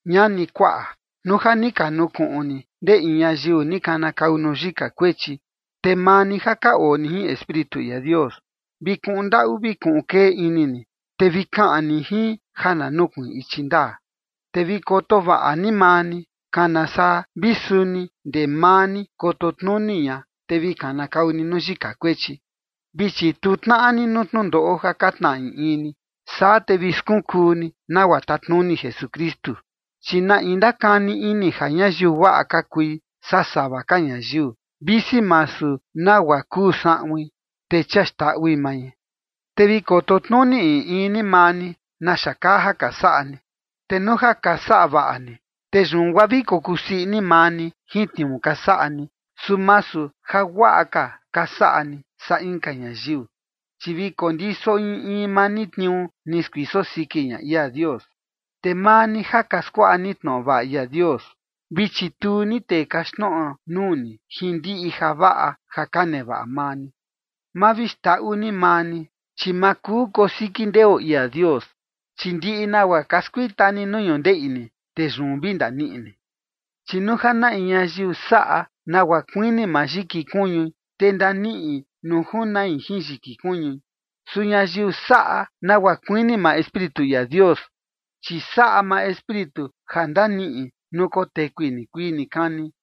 Ñani, kuaꞌa, nuu ja ni ka nukuꞌun ni ndee in ñayiu ni kanakau nuu yika kuechi, te maa ni ja ka oo ni jin Espíritu ia Dios, vi kuꞌun ndaꞌu vi kuꞌun kee ini ni, te vi kaꞌan ni jin ja na nukuiin ichi ndaa. Te vi koto vaꞌa ni maa ni, kana saa vi suni ndee maa ni koto tnuni ña, te vi kanakau nuu yika kuechi. Vi chituu tnaꞌa ni nuu tnundoꞌo ja ka tnaꞌa in in ni, saa te vi skunkuu ni nagua tatnuni Jesukristu. Chi na in ndakani ini ja ñayiu guaꞌa ka kui saa sava ka ñayiu, visi masu nagua kuu saꞌuin, te chia xndaꞌui mai. Te vi koto tnuni in in ni maa ni naxa kaa ja ka saꞌa ni. Te nuu ja ka saꞌa vaꞌa ni, te yun guaa vi kokusii ini maa ni jin tniuu ka saꞌa ni, su masu ja guaꞌa ka ka saꞌa ni saa inka ñayiu. Chi vi kondiso in in maa ni tniuu ni skuiso siki ña ia Dios. Te maa ni ja ka skuaꞌa ni tnoꞌo vaꞌa ia Dios, vi chituu ni tee kaxtnoꞌo nuu ni jin ndiꞌi javaꞌa ja ka nevaꞌa maa ni. Ma vi xndaꞌu ni maa ni, chi ma kuu kosiki ndeo ia Dios. Chi ndiꞌi nagua ka skuita ni nuu ñundeꞌi ni, te yun vi ndaniꞌi ni. Chi nuu ja in ñayiu saꞌa nagua kuini maa yiki kuñui, te ndaniꞌi nuu junai jin yiki kuñui. Su ñayiu saꞌa nagua kuini maa Espíritu ia Dios, chi saꞌa maa Espíritu ja ndaniꞌi nuu kotekui nikuii nikani.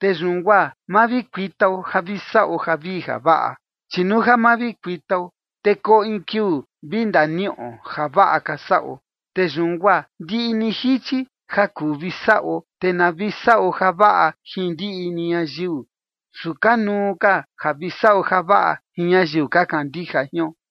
Te yun guaa ma vi kuitao ja vi saꞌo javii javaꞌa, chi nuu ja ma vi kuitao, te koo in kiuu vi ndaniꞌo javaꞌa ka saꞌo. Te yun guaa ndiꞌi ni jichi ja kuu vi saꞌo, te na vi saꞌo javaꞌa jin ndiꞌi ni ñayiu, su kanuu ka ja vi saꞌo javaꞌa jin ñayiu ka kandija jion.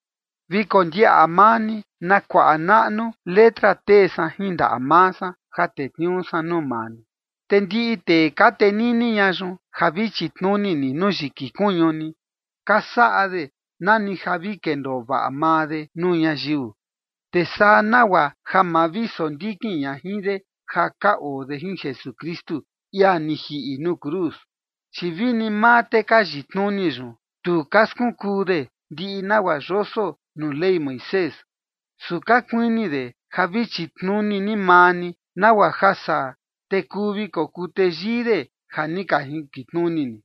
Vi kondiaꞌa maa ni na kuaꞌa naꞌnu letra tee san jin ndaꞌa maa san ja tetniuu san nuu maa ni. Te ndiꞌi tee ka tenini ña yun ja vi chitnuni ni nuu yiki kuñu ni, ka saꞌa de nani ja vi kendoo vaꞌa maa de nuu ñayiu, te saa nagua ja ma vi sondikin ña jin de ja ka oo de jin Jesukristu, ia ni jiꞌi nuu cruz. Chi vini maa tee ka yitnuni yun, tu ka skunkuu de ndiꞌi nagua yoso nuu Ley Moisés. Su ka kuini de ja vi chitnuni ni maa ni, nagua ja saa, te kuu vi kokuu teyii de ja ni ka jinkitnuni ni.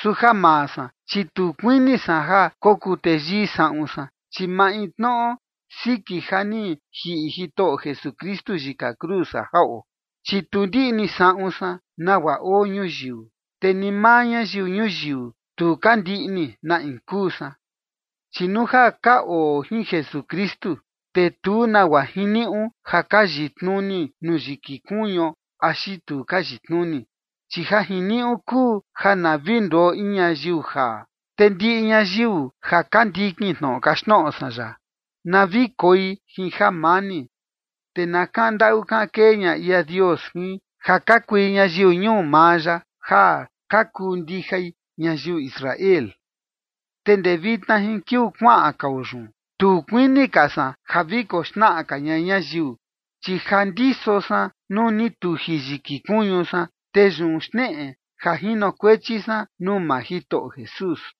Su ja maa san, chi tu kuini san ja kokuu teyii saꞌun san, chi maintnoꞌo siki ja ni jiꞌi Jitoꞌo Jesukristu yika cruz ja jaꞌo. Chi tu ndiꞌni saꞌun san nagua oo ñuyiu, te ni maa ñayiu ñuyiu, tu ka ndiꞌni na in kuu san. Chi nuu ja ka oo jin Jesukristu, te tu nagua jiniuꞌu a ka yitnuni nuu yiki kuñuo axi tu ka yitnuni, chi ja jiniuꞌu kuu ja na vi nduo in ñayiu jaa. Te ndiꞌi ñayiu ja ka ndikin tnoꞌo kaxtnoꞌo san yaꞌa, na vi koi jin jamani, te na kaꞌan ndaꞌu kaꞌan kee ña ia Dios jin, ja ka kui ñayiu ñuu maa ya ja ka kuu ndijai ñayiu Israel. Te ndee vitna jin kiuu kuaꞌan kao yun, tu kuini ka san ja vi koxnaꞌa ka ña ñayiu, chi ja ndiso san nuu ni tuji yiki kuñu san. Te yun xneꞌe ja jinokuechi san nuu maa Jitoꞌo Jesús.